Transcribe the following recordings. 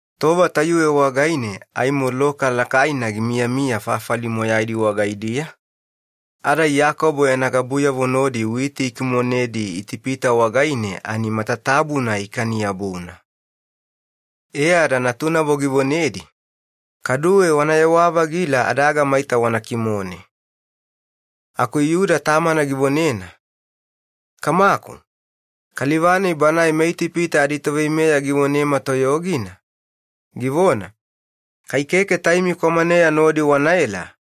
Tova tayuwe wagaine aimo loka lakaina gimiyamiya fafali moyaidi wagaidiya, ada Iyakobo yana gabuyavo nodi witi ikimonedi ani matatabuna ikani-yabuna. E ada givonedi, “Kaduwe wanayewa-vagila adaga maita wana kimone.” Aku Yuda tamana givonena, “Kamaku, kaliva-nai banae meItipita aditoveimeya givonema toyogina, givona, ‘Keke kaduwe magigiku wanaita-vagile kai keke taimi kwamaneya nodi wanaela.’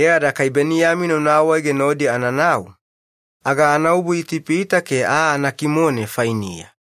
Ada kai Beniyamina una awaege nodi ananau, aga anaobu Itipita ke aa anakimone fainiya.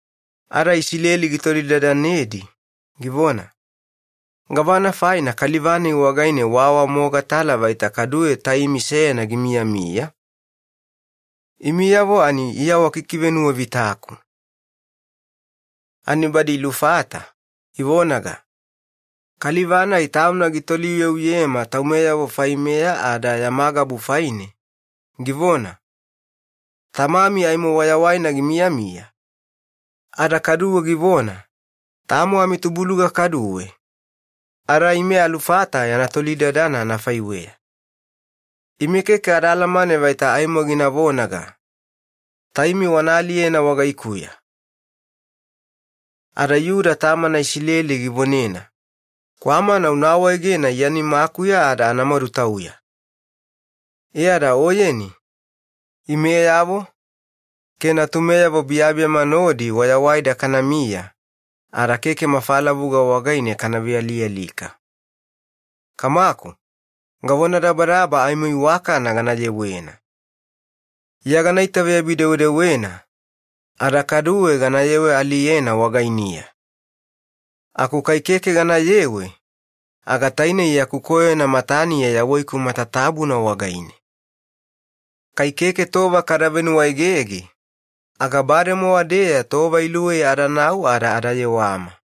Ada Isileli gitolidadanedi, givona, “Aku gavana faina kaliva-nai wagaine waawamogatala vaita kaduwe taimi seyana gimiyamiya? Imiyavo ani iya wakikivenuwavitaku.” Ani badi ilufata, ivonaga, “Kaliva-nai tauna gitoliuyeuyema taumeyavo faimeya ada yama gabu faine, givona, ‘Tamami aimo wayawaina gimiyamiya?’ Ada kaduwe givona, ‘Tamo taimi?’ Ada ime alufata yana tolidadana anafaiweya. Ime keke adaalamane vaita aimo gina vonaga, ‘Taimi wana aliyena wagaikuya.’” Ada Yuda tamana Isileli givonena, “Kwamana una awaegena iya nimakuya ke meyameyaganina anamadutauya, e ada oyeni, imeyavo ke natumeyavo biyabiyama nodi wayawaida kanamiya ada keke mafalavuga wagaine kana vealialika. Kamaku, gavonadabadaba aimo iwakana gana yewena. Iya aimo gana itaveyabi-dewedewena ada kaduwe ganayewe-aliyena wagainiya. Aku kai keke ganayewe aga tainei yaku koyona mataniya yawaiku matatabuna wagaine. Kai keke tova kada venuwaegege aga bademowa-deya tova luwei adanau ada adayewama.”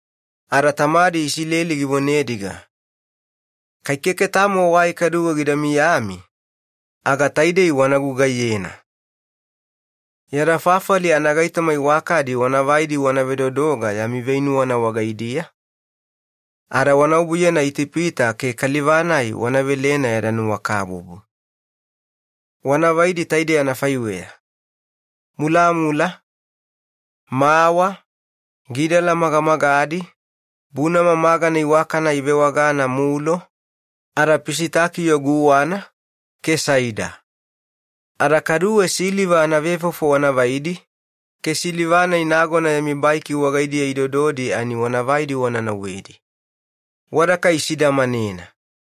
Ada Isileli givonediga, “Kai keke tamo wai kaduwe gida miyami, aga taidei wana gugaiyena. Yada fafali anagaitoma iwakadi wanavaidi wana vedodoga yami veinuwana wagaidiya ke wana obuyena Itipita ke kaliva-nai wana velena yada nuwakabubu. Wanavaidi anafaiweya, mulamula, mawa, gidala magamagadina, bunama magana iwakana ada pisitakio guwana ke saida. Ada kaduwe siliva anavefofo wanavaidi, ke siliva-nai nagona yami baiki wagaidiya idododi ani wanavaidi wana nauwedi. Wada kai isidamanena.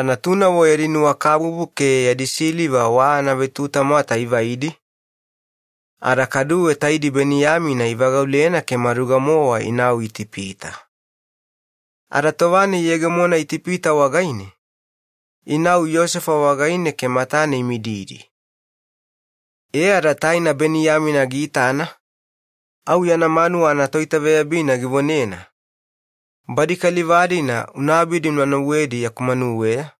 Ada natunavo yadi nuwakabubu ke yadi siliva anavetutamwata ivaidi, ada kaduwe taidi Beniyamina ivagaulena ke maduga-mowa inau Itipita. Ada tova-nai iyegemona fafali-nai wagaine, inau Yosefa wagaine ke matane imididina. E ada taina Beniyamina giitana, au yana manuwa anatoitaveyabina givonena, “Badi kaliva-dina una abidi una nauwedi yaku manuweya,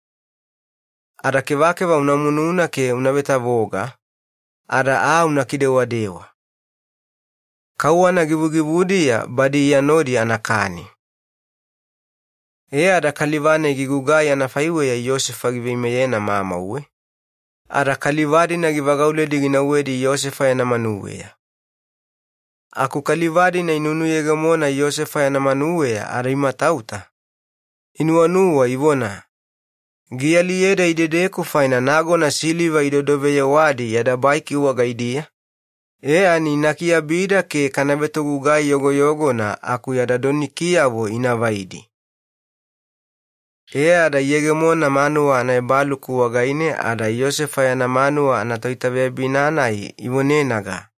ada kevakeva una mununa ke una vetavoga, ada aa una kidewadewa. Kauwana givugivudiya badi iya nodi anakani.” Ada togugai-nai gigugai anafaiweya Yosefa giveimeyena mamauwe, ada kaliva-dina givagauledi ginauwedi Yosefa yana manuweya. Aku kaliva-dina inunuyegemona Yosefa yana manuweya ada imatauta, inuwanuwa ivona, “Gialiyeda idedeku faina nagona siliva idodoveyewadi yada baiki wagaidiya, e ani ina kiabida ke kana vetogugai yogoyogona aku yada donikiyavo inavaidi.” E ada inau manuwa anaebaluku wagaine ada togugai-nai ivonenaga,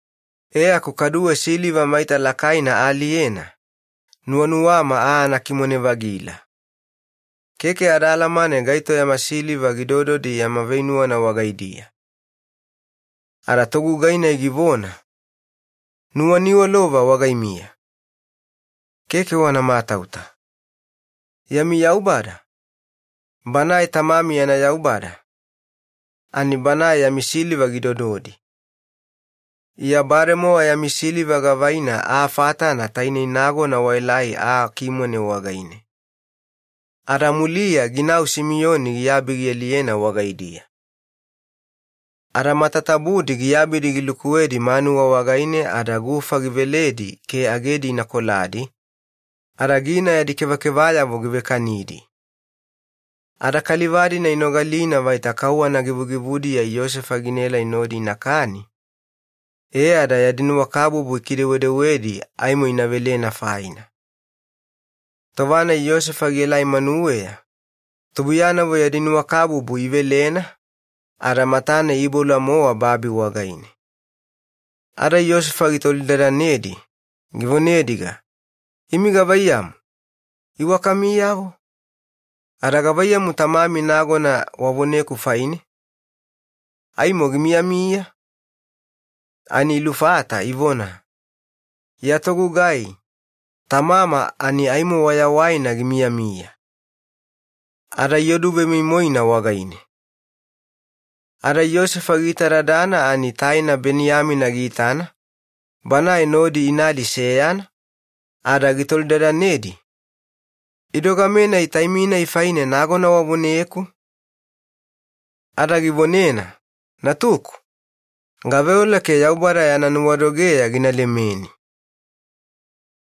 E aku kaduwe siliva maita lakaina aaliyena nuwanuwama aa anakimone-vagila. Keke adaalamane gaito yama siliva gidododi yama veinuwana wagaidiya.” Ada togugai-nai givona, “Ina iwakana. Keke wana matauta. Yami Yaubada Banae tamami yana Yaubada yami siliva gidododi. Iya bademowa yami siliva gavaina aa fatana tainei nagona waelai aa kimone wagaine,” e ada muliya ginau Simiyoni giabi gialiyena wagaidiya. Ada matatabudi giabidi gilukuwedi manuwa negenine ke gufa giveledi agedi ikoladi, ada gina yadi kevakevayavo givekanidi. Ada kaliva-dina inogalina vaita kauwana givugivudiya Yosefa ginaelai nodi inakani, e ada yadi nuwakabubu ikidewedewedi aimo ina velena faina. Tova-nai Yosefa gielai manuweya, tubuiyanavo yadi nuwakabubu ivelena ada matane iiboula-mowa babi wagaine. Ada Yosefa tubuiyanavo gitolidadanedi, givonediga, “Imi gavaiyamu, iwakamiyavo? Gavaiyamu tamami nagona wavoneku faine, aimo gimiyamiya?” Ani ilufata ivona, “Ya togugai, tamama aimo wayawaina gimiyamiya.” Ada ioduvemoimoina wagaine. Ada Yosefa giitadadana ani taina Beniyamina giitana, banae nodi inadi seyana, ada gitolidadanedi, “Idogamenai taimi-nai faine nagona wavoneku?” Ada givonena, “Natuku, gaveola vaita Yaubada yana nuwadogeya gina lemeni.”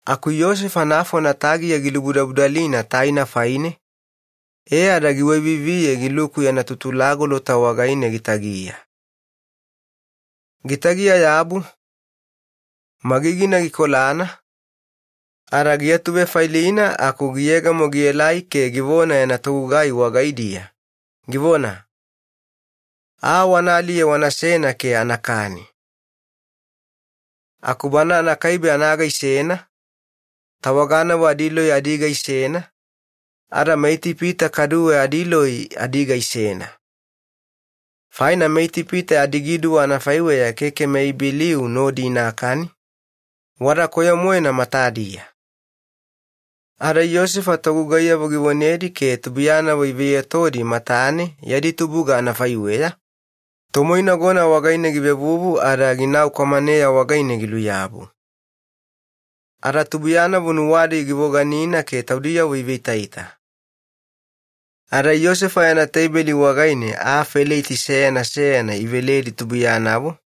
Aku Yosefa nafona tagiya gilubudabudalina taina faine ada giwaiviviye giluku yana tutulagolota wagaine gitagiya. Gitagiya-yabu, magigina gikolana, ada giatuvefailina aku giyegemo gielai ke givona yana togugai wagaidiya, givona, “Aa wanaaliye wanasena ke anakani.” Aku bana anakaibe anaga isena, tawaganavo adiloi adiga isena, ada meItipita kaduwe adiloi adiga isena. Faina meItipita adigiduwa anafaiweya keke meIbeliu nodi inakani, wada koyo-moena matadiya. Ada Yosefa togugaiyavo givonedi ke tubuiyanavo iveiyotodi matane yadi tubuga anafaiweya, tomoinagona wagaine givevuvu ada ginau kwamaneya wagaine giluyabu. Ada tubuiyanavo nuwadi givoganina ke taudiyavo iveitaita. Ada Yosefa yana tebeli wagaine aa feleiti seyana seyana iveledi tubuiyanavo,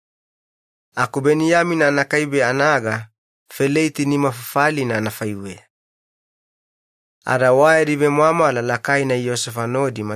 aku Beniyamina anakaibe anaga feleiti nimafafalina anafaiweya. Ada matatabudi ikani ke iyuga wayadi vemwamwala lakaina Yosefa nodi.